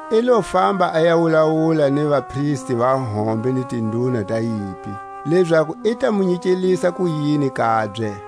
I lo famba a ya wulawula ni vapristi va hombe ni tinduna ta yimpi, lezaku i ta mu nyikelisa kuyini kabye.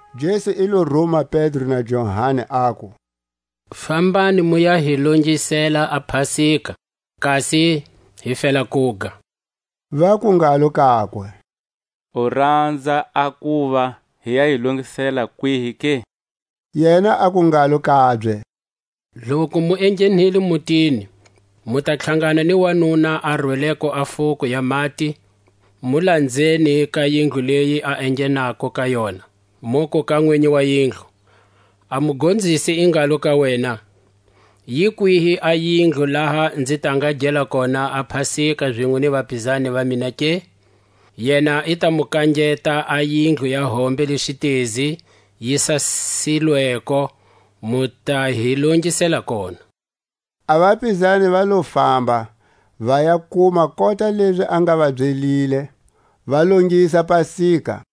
Jesu i lo ruma Pedro na Johani, aku: Fambani mu ya hi longisela a pasika, kasi hi fela kuga. Vaku ngalo kakwe: U ranza a kuva hi ya yi longisela kwihi ke? Yena aku ngalo kabye: Loku mu enghenile mutini, mu ta tlhangana ni wanuna a rweleko a fuko ya mati; mu lanzeni ka yindlu leyi a enghenako ka yona; muku ka nwinyi wa yindlu: A Mugonzisi i ngalo ka wena, Yi kwihi a yindlu, laha nzi ta nga gela kona a pasika zinwe ni vapizani va mina ke? Yena i ta mu kangeta a yindlu ya hombe le xitezi yi sasisilweko, mu ta hi longisela kona. A vapizani va lo famba, va ya kuma kota lezi a nga va byelile; va longisa pasika.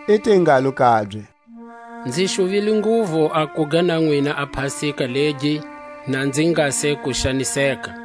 I te ngalo kabye: Nzi xuvile nguvu a kuga na nwina a pasika legi, na nzi nga se ku xaniseka;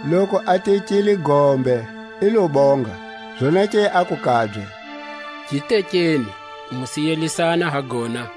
Loku a tekile gombe, i lo bonga, zonake aku kabye: Gi tekeni, mu siyelisana ha gona;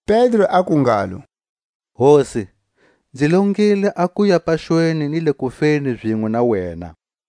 Pedro aku ngalo: Hosi, nzi longile a kuya paxweni ni le kufeni zinwe na wena.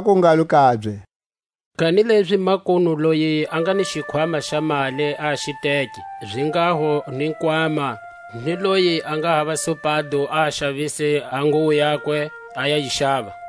Aku ngalo kabye: Kanilezi makunu, loyi a nga ni xikhwama xa mali, a xi teke, zinghaho ni nkwama; ni loyi a nga hava supado, a xavise a nguwo yakwe, a ya yi xava.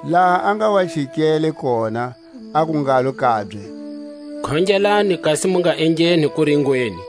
Laha a nga wa chikele kona, aku ngalo kabye: Khongelani kasi mu nga engheni kuringweni.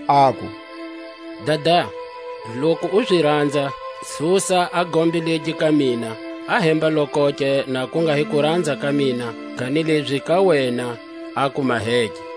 aku: Dada, loku u zi ranza, susa a gombe legi ka mina; ahemba-lokoke, na ku nga hi kuranza ka mina, kanilezi ka wena a ku maheke.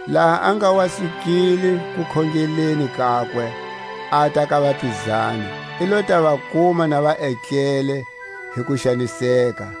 Laha a nga wa sukile kukhongeleni kakwe, ata ka vapizani, i lo ta va kuma na va etlele hi kuxaniseka,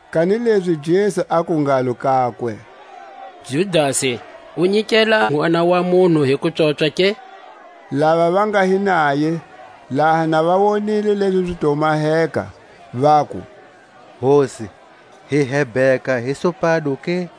Kanilezi Jesu aku ngalo kakwe: Judasi, u nyikela Nʼwana wa munhu hi kupswopswa ke? Lava va nga hi naye, laha na va wonile lezi zi to maheka, vaku: Hosi, hi hebheka hi supado ke?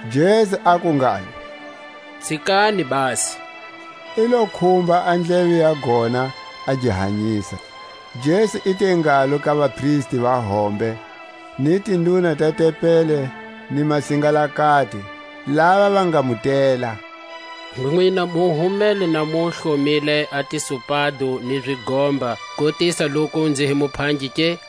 Jesu aku ngalo: Tsikani, basi! I lo khumba a ndleve ya gona, a gi hanyisa. Jesu i te ngalo ka vapristi va hombe, ni tinduna ta tempeli, ni masingalakati, lava va nga mu tela: Nwina mu humele na mu hlomile a tisupado ni zigomba, kukotisa loku nzi hi muphangi ke?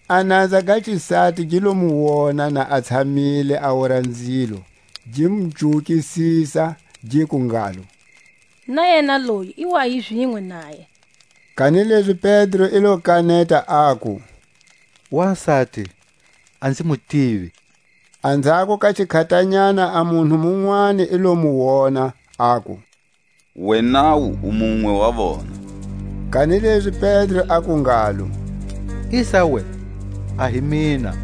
A nanza ga xisati gi lo mu wona na a tshamile a wora nzilo, gi mu cuwukisisa, giku ngalo: Na yena loyi i wa hi zinwe naye. Kanilezi Pedro i lo kaneta, aku: Wasati, a nzi mu tivi. Anzhako ka xikhatanyana a munhu munwani i lo mu wona, aku: Wenawu u munwe wa vona. Kanilezi Pedro aku ngalo: Isawe, a hi mina.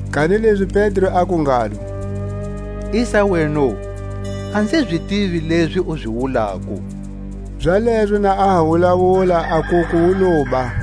Kanilezi Pedro aku ngalo: Isaweno, a nzi zi tivi lezi u zi wulako! Zalezo na a ha wulawula a nkuku wu loba.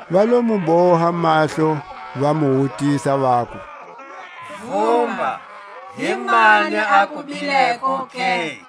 Va lo mu boha mahlo, va mu wutisa, vaku: Vumba, himani a ku bileko ke?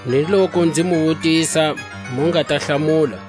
ni loku nzi mu wutisa, mu nga ta hlamula.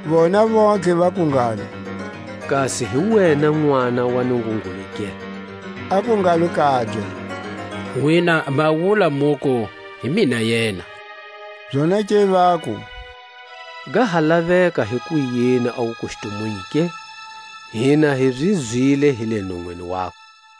Vona vontlhe vaku ngalo: Kasi hi wena Nʼwana wa Nungungulu ke? Aku ngalo kabye: Nwina ma wula muku, hi mina yena. Zonake vaku: Ga ha laveka hikuyini a wukustumunyu ke? Hina hi zi zwile hi le nonwini wakwe.